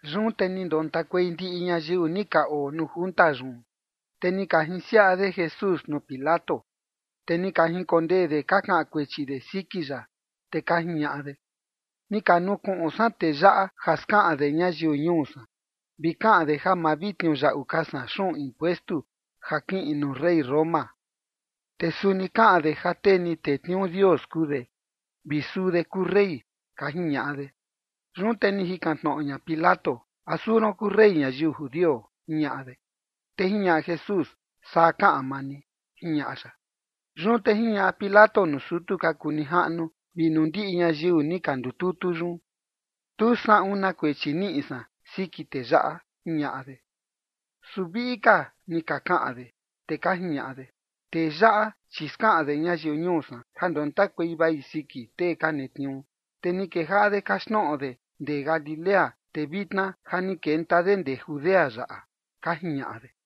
Yun te ni ndontakuei ndiꞌi ñayiu ni ka oo nuu junta yun. Te ni ka jinsiaꞌa de Jesús nuu Pilato. Te ni ka jinkondee de ka kaꞌan kuechi de siki ya, te ka jiñaꞌa de: ―Ni ka nukuꞌun san tee yaꞌa ja skaꞌan de ñayiu ñuu san, vi kaꞌan de ja ma vi tniuyaꞌu ka san xuꞌun impuestu ja kiꞌin nuu rey ñuu Roma. Te suni kaꞌan de ja tee ni tetniuu Dios kuu de, vi suu de kuu rey ―ka jiñaꞌa de. Yun te ni jikan tnoꞌo ña Pilato: ―¿A suu ron kuu rey ñayiu judio? ―jiñaꞌa de. Te jiñaꞌa Jesús: ―Saa kaꞌan maa ni ―jiñaꞌa ya. Yun te jiñaꞌa Pilato nuu sutu ka kuu nijaꞌnu vi nuu ndiꞌi ñayiu ni ka ndututu yun: ―Tu saꞌun na kuechi niꞌi san siki tee yaꞌa ―jiñaꞌa de. Su viꞌi ka ni ka kaꞌan de, te ka jiñaꞌa de: ―Tee yaꞌa, chi skaꞌan de ñayiu ñuu san ja ndontakuei vai siki tee ka netniuu. Te ni kejaꞌa de kaxtnoꞌo de ndee Galilea, te vitna ja ni kenta de ndee Judea yaꞌa ―ka jiñaꞌa de.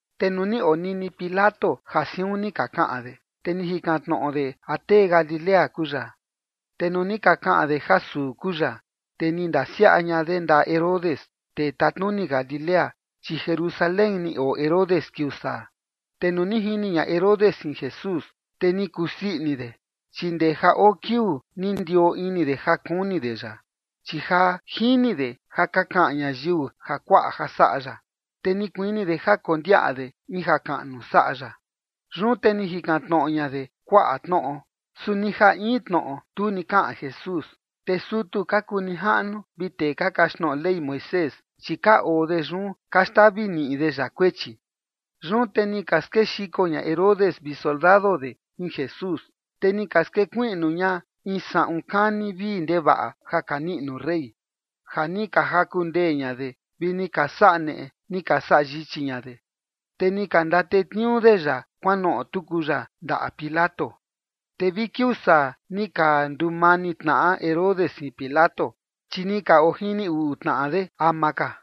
Te nuu ni onini Pilato ja siun ni ka kaꞌan de, te ni jikan tnoꞌo de a tee Galilea kuu ya. Te nuu ni ka kaꞌan de ja suu kuu ya, te ni ndasiaꞌa ña de ndaꞌa Herodes, tee tatnuni Galilea, chi Jerusalén ni oo Herodes kiuu saa. Te nuu ni jini ña Herodes jin Jesús, te ni kusii ini de, chi ndee ja oo kiuu ni ondioo ini de ja kuni de ya, chi ja jini de ja ka kaꞌan ñayiu jakuaꞌa ja saꞌa ya, te ni kuini de ja kondiaꞌa de in jakaꞌnu saꞌa ya. Yun te ni jikan tnoꞌo ña de kuaꞌa tnoꞌo, su ni ja in tnoꞌo tu ni kaꞌan Jesús. Te sutu ka kuu nijaꞌnu vi tee ka kaxtnoꞌo Ley Moisés, chi ka oo de yun ka xtavi niꞌi de ya kuechi. Yun te ni ka skexiko ña Herodes vi soldado de jin Jesús, te ni ka skuiꞌnu ña in saꞌun kani vii ndevaꞌa ja ka niꞌnu rey, ja ni ka jaku ndee ña de, vi ni ka saꞌa neꞌe ni ka saꞌa yichi ña de. Te ni ka ndatetniuu de ya kuanoꞌo tuku ya ndaꞌa Pilato. Te vi kiuu saa ni ka ndumani tnaꞌa Herodes jin Pilato, chi ni ka ojini uꞌu tnaꞌa de ama ka.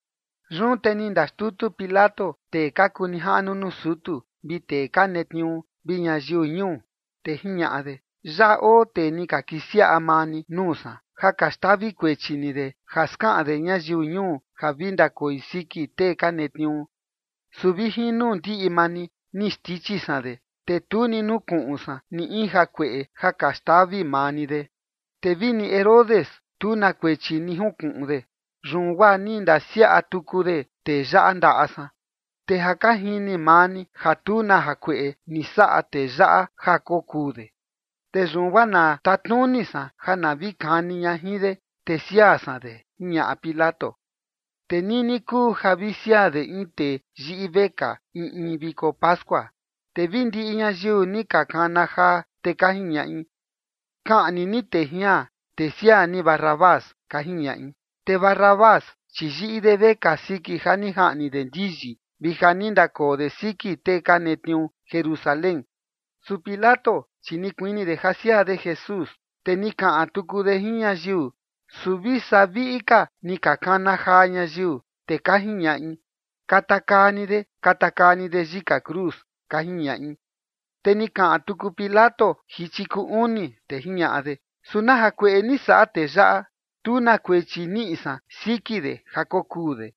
Yun te ni ndaxtutu Pilato tee ka kuu nijaꞌnu nuu sutu, vi tee ka netniuu, vi ñayiu ñuu, te jiñaꞌa de: ―Yaꞌa oo tee ni ka kisiaꞌa maa ni nuu san, ja ka xtavi kuechi ni de, ja skaꞌan de ñayiu ñuu ja vi ndakoi siki tee ka netniuu. Su vi jin nuu ndiꞌi maa ni ni xndichi san de, te tu ni nukuꞌun san ni in jakueꞌe ja ka xtavi maa ni de. Te vini Herodes, tu na kuechi ni jinkuꞌun de, yun guaa ni ndasiaꞌa tuku de tee yaꞌa ndaꞌa san. Te ja ka jini maa ni ja tu na jakueꞌe ni saꞌa tee yaꞌa ja kokuu de. Te yun guaa na tatnuni san ja na vi kani ña jin de, te siaa san de ―jiñaꞌa Pilato. Te nini kuu ja vi siaa de in tee yiꞌi vekaa in in viko pascua. Te vi ndiꞌi ñayiu ni ka kana jaa, te ka jiñaꞌi: ―¡Kaꞌni ni tee jian, te siaa ni Barrabás! ―ka jiñaꞌi. Te Barrabás, chi yiꞌi de vekaa siki ja ni jaꞌni de ndiyi, vi ja ni ndakoo de siki tee ka netniuu Jerusalén. Su Pilato, chi ni kuini de ja siaa de Jesús, te ni kaꞌan tuku de jin ñayiu. Su vi saa viꞌi ka ni ka kana jaa ñayiu, te ka jiñaꞌi: ―¡Katakaa ni de! ¡Katakaa ni de yika cruz! ―ka jiñaꞌi. Te ni kaꞌan tuku Pilato jichi kuu uni, te jiñaꞌa de: ―¿Su na jakueꞌe ni saꞌa tee yaꞌa? Tu na kuechi niꞌi san siki de ja kokuu de.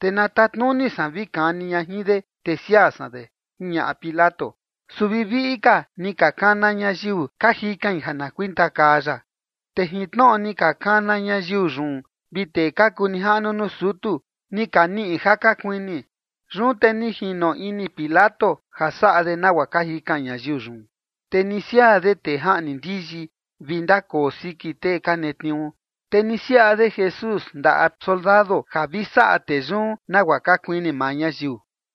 Te na tatnuni san vi kani ña jin de, te siaa san de ―jiñaꞌa Pilato. Su vi viꞌi ka ni ka kana ñayiu ka jikain ja na kuitakaa ya, te jin tnoꞌo ni ka kana ñayiu yun vi tee ka kuu nijaꞌnu nuu sutu, ni ka niꞌi ja ka kuini. Yun te ni jino ini Pilato ja saꞌa de nagua ka jikan ñayiu yun. Te ni siaa de tee jaꞌni ndiyi vi ndakoo siki tee ka netniuu. Te ni siaꞌa de Jesús ndaꞌa soldado ja vi saꞌa tee yun nagua ka kuini maa ñayiu.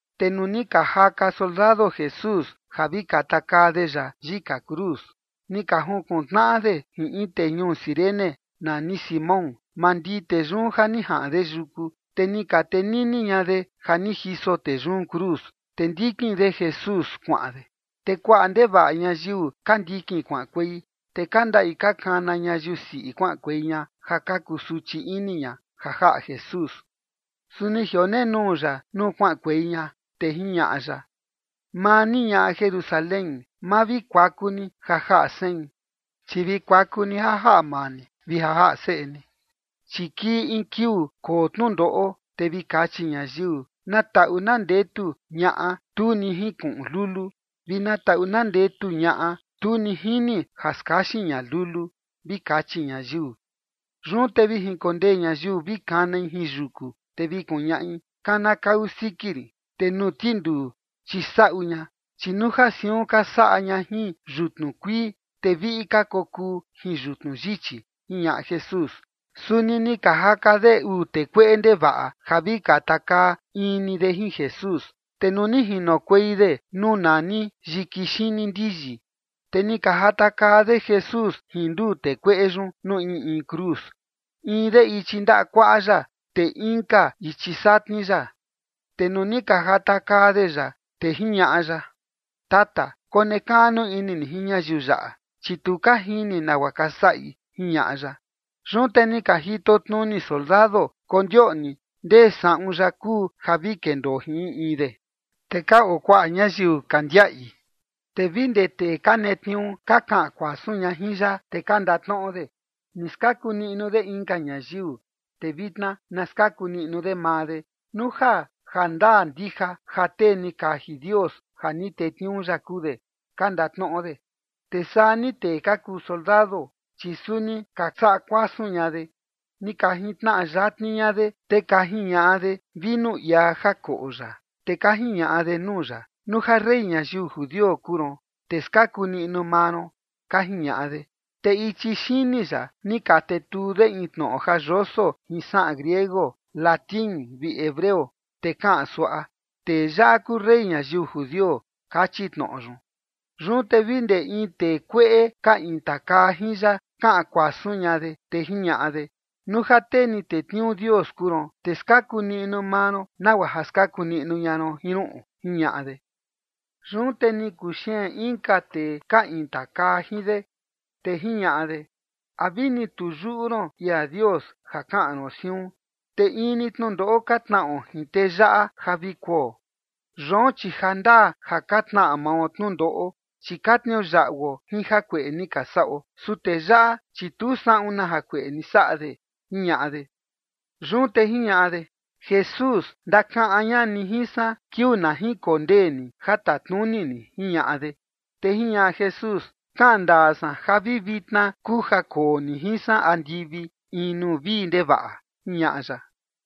Te nuu ni ka jaka soldado Jesús ja vi katakaa de ya yika cruz, ni ka junkuntnaꞌa de jin in tee ñuu Cirene nani Simón. Mandii tee yun ja ni jaꞌan de yuku, te ni ka tenini ña de ja ni jiso tee yun cruz, te ndikin de Jesús kuaꞌan de. Te kuaꞌa ndevaꞌa ñayiu ka ndikin kuaꞌankuei, te ka ndaꞌi ka kana ñayiu siꞌi kuaꞌankuei ña ja ka kuu suchi ini ña ja jaꞌa Jesús. Su ni jionenuu ya nuu kuaꞌankuei ña, te jiñaꞌa ya: ―Maa ni ñaꞌa Jerusalén, ma vi kuaku ni ja jaꞌa sein, chi vi kuaku ni ja jaꞌa maa ni vi ja jaꞌa seꞌe ni. Chi kii in kiuu koo tnundoꞌo, te vi kachi ñayiu: “Na taꞌu na ndetu ñaꞌa tu ni jinkuꞌun lulu, vi na taꞌu na ndetu ñaꞌa tu ni jini ja skaxin ña lulu” vi kachi ñayiu. Yun te vi jinkondee ñayiu vi kanai jin yuku, te vi kuñaꞌi: “Kanakau siki rin” te nuu tinduu: “Chisaꞌu ña”. Chi nuu ja siun ka saꞌa ña jin yutnu kuii, te viꞌi ka kokuu jin yutnu yichi ―jiñaꞌa Jesús. Suni ni ka jaka de uu tee kueꞌe ndevaꞌa ja vi katakaa in ni de jin Jesús. Te nuu ni jinokuei de nuu nani yiki xini ndiyi, te ni ka jatakaa de Jesús jin nduu tee kueꞌe yun nuu in in cruz, in de ichi ndaꞌa kuaꞌa ya, te inka ichi satni ya. Te nuu ni ka jatakaa de ya, te jiñaꞌa ya: ―Tata, konekaꞌnu ini ni jin ñayiu yaꞌa, chi tu ka jini nagua ka saꞌi ―jiñaꞌa ya. Yun te ni ka jitotnuni soldado, kondioꞌni ndee saꞌun ya kuu ja vi kendoo jin in in de. Te ka oo kuaꞌa ñayiu ka ndiaꞌi, te vi ndee tee ka netniuu ka kaꞌan kuasun ña jin ya, te ka ndatnoꞌo de: ―Ni skaku niꞌnu de inka ñayiu. Te vitna na skaku niꞌnu de maa de, nuu ja ja ndaa ndija ja tee ni kaji Dios ja ni tetniuu ya kuu de ―ka ndatnoꞌo de. Te saa ni tee ka kuu soldado, chi suni ka saꞌa kuasun ña de. Ni ka jintnaꞌa yatni ña de, te ka jiñaꞌa de vinu iaa ja koꞌo ya. Te ka jiñaꞌa de nuu ya: ―Nuu ja rey ñayiu judio kuu ron, te skaku niꞌnu maa ron ―ka jiñaꞌa de. Te ichi xini ya ni ka tetuu de in tnoꞌo ja yoso jin saꞌan griego, latín vi hebreo, te kaꞌan suaꞌa: “Tee yaꞌa kuu rey ñayiu judio”, kachi tnoꞌo yun. Yun te vi ndee in tee kueꞌe ka intakaa jin ya kaꞌan kuasun ña de, te jiñaꞌa de: ―Nuu ja tee ni tetniuu Dios kuu ron, te skaku niꞌnu maa ron nagua ja skaku niꞌnu ña ron jin ruꞌun ―jiñaꞌa de. Yun te ni kuxeen inka tee ka intakaa jin de, te jiñaꞌa de: ―¿A vini tu yuꞌu ron ia Dios ja kaꞌan ron siun? Te in ni tnundoꞌo ka tnaꞌo jin tee yaꞌa ja vi kuo. Yoon, chi ja ndaa ja ka tnaꞌa mao tnundoꞌo, chi ka tniuyaꞌuo jin jakueꞌe ni ka saꞌo. Su tee yaꞌa, chi tu saꞌun na jakueꞌe ni saꞌa de ―jiñaꞌa de. Yun te jiñaꞌa de: ―Jesús, ndakaꞌan ña ni jin san kiuu na jinkondee ni ja tatnuni ni ―jiñaꞌa de. Te jiñaꞌa Jesús: ―Kaꞌan ndaa san ja vi vitna kuu ja koo ni jin san andivi in nuu vii ndevaꞌa ―jiñaꞌa ya.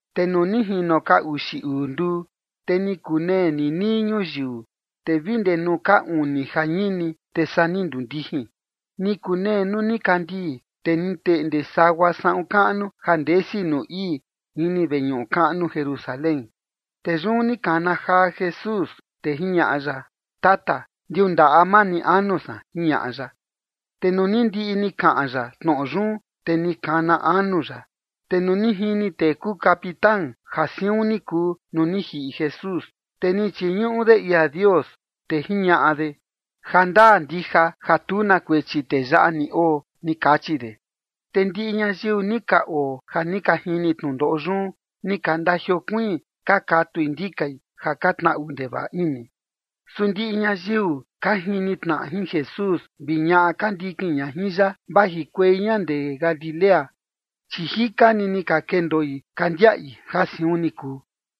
Te nuu ni jino ka uxi uu nduu, te ni kunee ninii ñuyiu, te vi ndee nuu ka uni jañini, te saa ni nduu ndijin. Ni kunee nuu nikandii, te ni teꞌnde sagua saꞌun kaꞌnu ja ndesi nuu ii, ini veñuꞌu kaꞌnu Jerusalén. Te yun ni kana jaa Jesús, te jiñaꞌa ya: ―Tata, ndiundaꞌa maa ni anu san ―jiñaꞌa ya. Te nuu ni ndiꞌi ni kaꞌan ya tnoꞌo yun, te ni kana anu ya. Te nuu ni jini tee kuu capitán ja siun ni kuu nuu ni jiꞌi Jesús, te ni chiñuꞌu de ia Dios, te jiñaꞌa de: ―Ja ndaa ndija ja tu na kuechi tee yaꞌa ni oo ―ni kachi de. Te ndiꞌi ñayiu ni ka oo ja ni ka jini tnundoꞌo yun, ni ka ndajiokuiin ka katui ndikai ja ka tnaꞌu ndevaꞌa ini. Su ndiꞌi ñayiu ka jini tnaꞌa jin Jesús vi ñaꞌa ka ndikin ña jin ya, vajikuei ña ndee Galilea, chi jika ni ni ka kendoi ka ndiaꞌi ja siun ni kuu.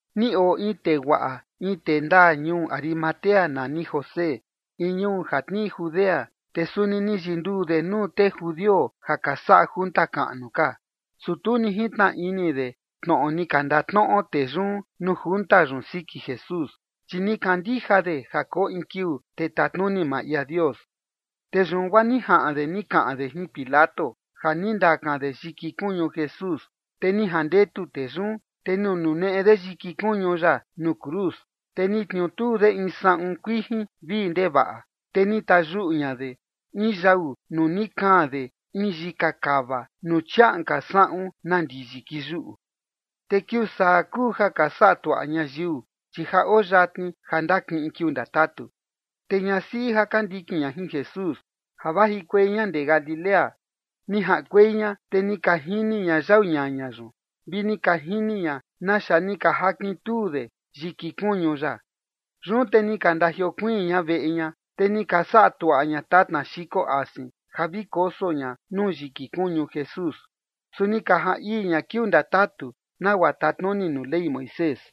Ni oo in tee guaꞌa, in tee ndaa ñuu Arimatea nani José, in ñuu ja tnii Judea, te suni ni yinduu de nuu tee judio ja ka saꞌa junta kaꞌnu ka. Su tu ni jintnaꞌa ini de tnoꞌo ni ka ndatnoꞌo tee yun nuu junta yun siki Jesús, chi ni kandija de ja koo in kiuu te tatnuni maa ia Dios. Te yun guaa ni jaꞌan de ni kaꞌan de jin Pilato ja ni ndakan de yiki kuñu Jesús, te ni jandetu tee yun. Te ni nuneꞌe de yiki kuñu ya nuu cruz, te ni tniutuu de jin in saꞌun kuijin vii ndevaꞌa, te ni tayuꞌu ña de in yau nuu ni kaan de in yiki kava nuu chiaꞌan ka saꞌun na ndiyi kiyuꞌu. Te kiuu saa kuu ja ka saꞌa tuaꞌa ñayiu, chi ja oo yatni ja ndakiꞌin kiuu ndatatu. Te ñasiꞌi ja ka ndikin ña jin Jesús ja vajikuei ña ndee Galilea, ni jaꞌankuei ña, te ni ka jini ña yau ñaña yun, vi ni ka jini ña naxa ni ka jakintuu de yiki kuñu ya. Yun te ni ka ndajiokuiin ña veꞌe ña, te ni ka saꞌa tuaꞌa ña tatna xiko asin ja vi koso ña nuu yiki kuñu Jesús. Su ni ka jaan ii ña kiuu ndatatu, nagua tatnuni nuu Ley Moisés.